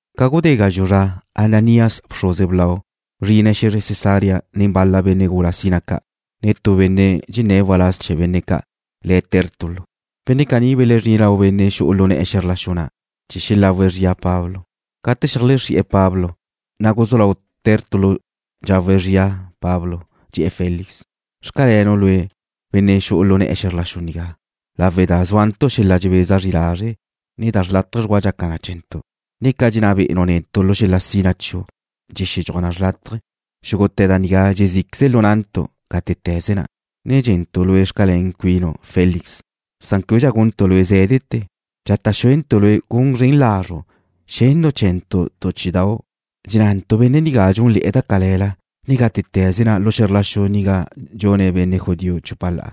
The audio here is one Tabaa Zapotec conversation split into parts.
Ca gudé gazxu' zra, Ananías, bxruze blau, bzrine̱' xe̱zre Cesarea nen bal-la benne' gula sina ca', ne tu benne' dxenné̱' waláz chee̱ benne' ca', le̱' Tértulo. Benne' caní belezrine̱' lau benne' xu'u lu ne̱'e̱ xe̱zr la xu na' chee̱ xelagu zria Pablo. Gate xeajlexrí'e̱ Pablo, na' guzú lau Tértulo dxawe̱' xria Pablo, dxe̱'e̱ Félix: ―Xcalenu' lue', benne' xu'u lu na'u xe̱zr la xu nigá, lawe' da zúantu' xel-la' dxebeza zri lazre', na' da chawe' dxgua dxaca na chee̱ntu', na' ca dxenná be'enu' netu' lu xel-la' sina chiu' dxexedxúaj na chawe'. Xúgute̱ da nigá dxezí'queze lu na'ntu' gátete̱ze na', ne dxe̱ntu' lue' xcalén cuinu', Félix. Chee̱ québedxa guntu' lue' zé̱dete̱, dxata' xueda' lue' gun zren lazru' xennu' chee̱ntu' tu chí'idau'. Dxenná'antu' benne' nigá dxúnle̱'e̱ da cale̱la, ne gátete̱ze na' lu xe̱zr la xu nigá dxune̱' benne' judío chupa la'a,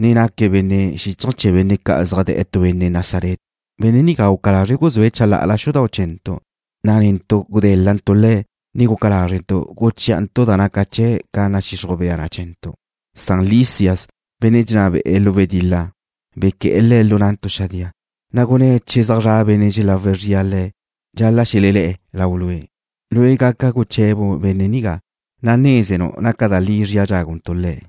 ne naque̱' benne' xíchaje̱ chee̱ benne' ca' zaj da' tu benne' Nazaret. Benne' nigá guca lazre̱' guzúe̱' chalá'ala xudau' chee̱ntu', na' netu' gudé̱l-lantu' le̱', ne guca lázrentu' guchí'antu' da naca chee̱' ca nadxixruj bea na chee̱ntu'. Na' Lisias, benne' dxenná be'e̱ lu wedil-la, bequé̱'e̱ le̱' lu na'ntu' xadía. Na' gunné̱' che zaj zra benne' xelagu zrie̱' Le̱', dxal-la' xelelé̱'e̱ lau lue'. Lue' gaca guche̱bu' benne' nigá, na' nézenu' naca da li zria dxáguntu' le̱'.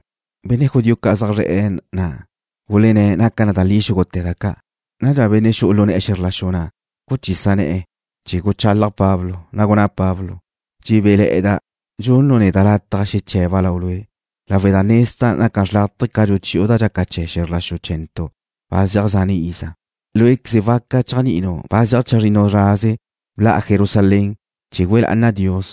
Benne' judío ca' zaj zre̱'e̱ na' gulenné̱' naca da li xúgute̱ da ca'. Nadxa benne' xu'u lu ne̱'e̱ xe̱zr la xu na' guchisa ne̱'e̱ chee̱ guchalaj Pablo, na' gunná Pablo: ―Dxebéle̱'e̱da' dxunu' neda' lataj xeche̱ba' lau lue', lawe' da nezda' naca xrlátaje ca dxuchi'u da dxaca chee̱ xe̱zr la xu chee̱ntu' ba zeaj zane' iza. Lué'queze waca chéajni'inu' ba zeaj chazrinnu zraze bla'a Jerusalén chee̱ güe lá'ana' Dios.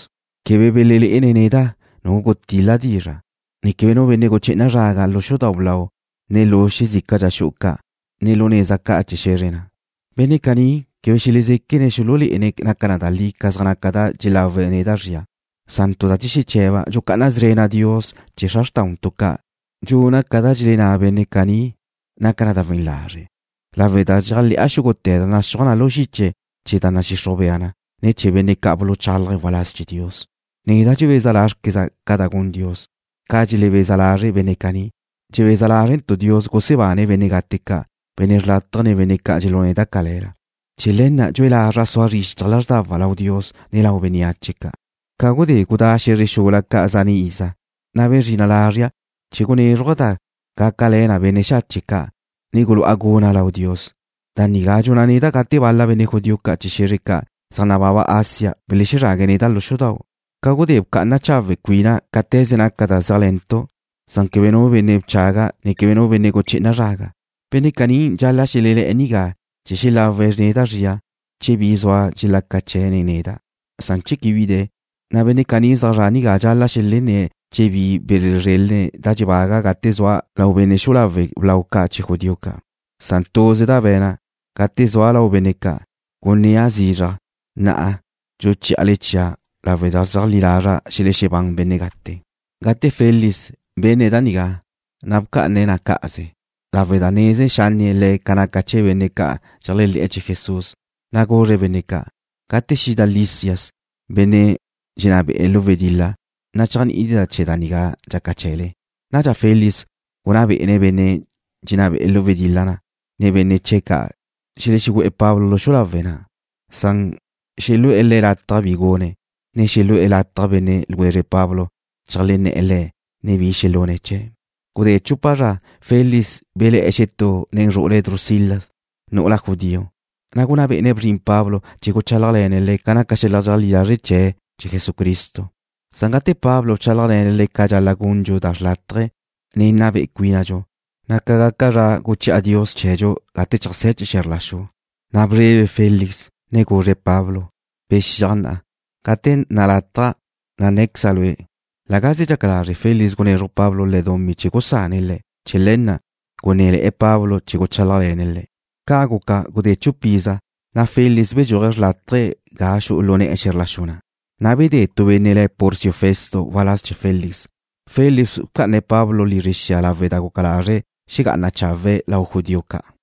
Quebe belelé'ene̱' neda' nu gutil-la' dizra', ne quebe nu benne' guché'ena' zraga lu xudau' blau, ne lu xezícala xu'u ca', ne lu neza ca' chee̱ xe̱zre na'. Benne' caní quebe xelezéquene̱' xululé'ene̱' naca da li ca zaj naca da dxelawe̱' neda' zria. Tu da dxexeche̱ba', dxucá'ana szrena' Dios chee̱ xra xrtáudxu ca', dxuna' ca da dxelenná benne' caní naca na da we̱n lazre', lawe' da dxéajle̱'a xúgute̱ da naxúaj na lu xiche chee̱ da nadxixruj bea na, ne chee̱ benne' ca' buluchálaje̱' waláz chee̱ Dios. Neda' dxebeza lázrqueza' ca da gun Dios, ca dxelebeza lazre' benne' caní, dxebeza lázrentu' Dios gusebane̱' benne' gate ca', benne' xrlátaje, ne benne' ca' dxelune̱' da cale̱la. Chee̱ le̱ na' dxue lazra' sua zri xichaj lázrdawa' lau Dios, ne lau bénneache ca'. ’Ca gudé gudá' xe̱zre xula ca' zane' iza, na' bezrina' lazria' chee̱ gunézruja' da gácale̱ na benne' xache' ca', ne cu'a guna' lau Dios. Da nigá dxuna' neda' gate bal-la benne' judío chee̱ xe̱zre ca' zaj nababa Asia belexezrague̱' neda' lu xudau' ca gudé bca'ana chawe' cuina' cáte̱ze naca da zéajle̱ntu', san quebe nu benne' bchaga', ne quebe nu benne' guché'ena' zraga. Benne' caní dxal-la' xelelé̱'e̱ nigá chee̱ xelawe̱' neda' zria che bi zua dxelaca chee̱' nen neda', san che quebe bi de̱, na' benne' caní zaj zre̱'e̱ nigá dxal-la' xelenné̱' che bi belezrélene̱' da dxebaga' gate zua' lau benne' xu'u lawe' blau ca' chee̱ judío ca'. Tuze da be̱na' gate zua' lau benne' ca', gunnéa' zizraj: Na'a dxuchí'ale chia' lawe' da dxeajlí lazra' xelexebán benne' gate. Gate Félix benne̱' da nigá, na' bca'ane̱' na cá'aze lawe' da neze xanne' le̱' ca naca chee̱ benne' ca' dxeléajle̱'e̱ chee̱ Jesús, na' guzre̱' benne' ca': ―Gate xida Lisias, benne' dxenná be'e̱ lu wedil-la, na' chéajni'idxeda' chee̱ da nigá dxaca chee̱le. Nadxa Félix gunná bé'ene̱' benne' dxenná be'e̱ lu wedil-la, ne benne' ca' dxenná be'ene̱' xelexegu'e̱ Pablo lu xu'u lawe' na', na' xelu'e̱ le̱' lataj bi gune̱', ne xelu'e̱ lataj benne' ljwezre Pablo cheajlenné̱'e̱ le̱', ne bi xelune̱' chee̱'. Gudé tu chupa zra Félix belé̱'e̱ xetú nen zru'ule̱' Drusila, nu'ula judío, na' gunná bé'ene̱' bzrin Pablo chee̱ guchálajle̱ne̱' le̱' ca naca xel-la' dxeajlí lazre' chee̱' chee̱ Jesucristo. Gate Pablo bchálajle̱ne̱' le̱' ca dxal-la' gundxu da xrlátaje, ne nna be'e cuínadxu, na' zrin zra guchi'a Dios chee̱dxu gate cheajsé̱ chee̱ xe̱zr la xu, na' bzrebe Félix, ne guzre̱' Pablo: ―Bexíaj na'a. Gate nalátaja', na' nné̱queza' lue'. La gaze dxaca lazre' Félix gunezruj Pablo le̱' dumí chee̱ gusane̱' le̱'. Chee̱ le̱ na' gunné̱le̱'e̱ Pablo chee̱ guchálajle̱ne̱' le̱'. Ca' guca, gudé chupa iza, na' Félix bedxúaje̱' xrlátaje̱' ga xu'u lu ne̱'e̱ xe̱zr la xu na', na' bedé tu benne' le̱' Porcio Festo waláz chee̱ Félix. Félix bca'ane̱' Pablo lizre xia lawe' da guca lazre̱' xegá'ane̱' chawe' lau judío ca'.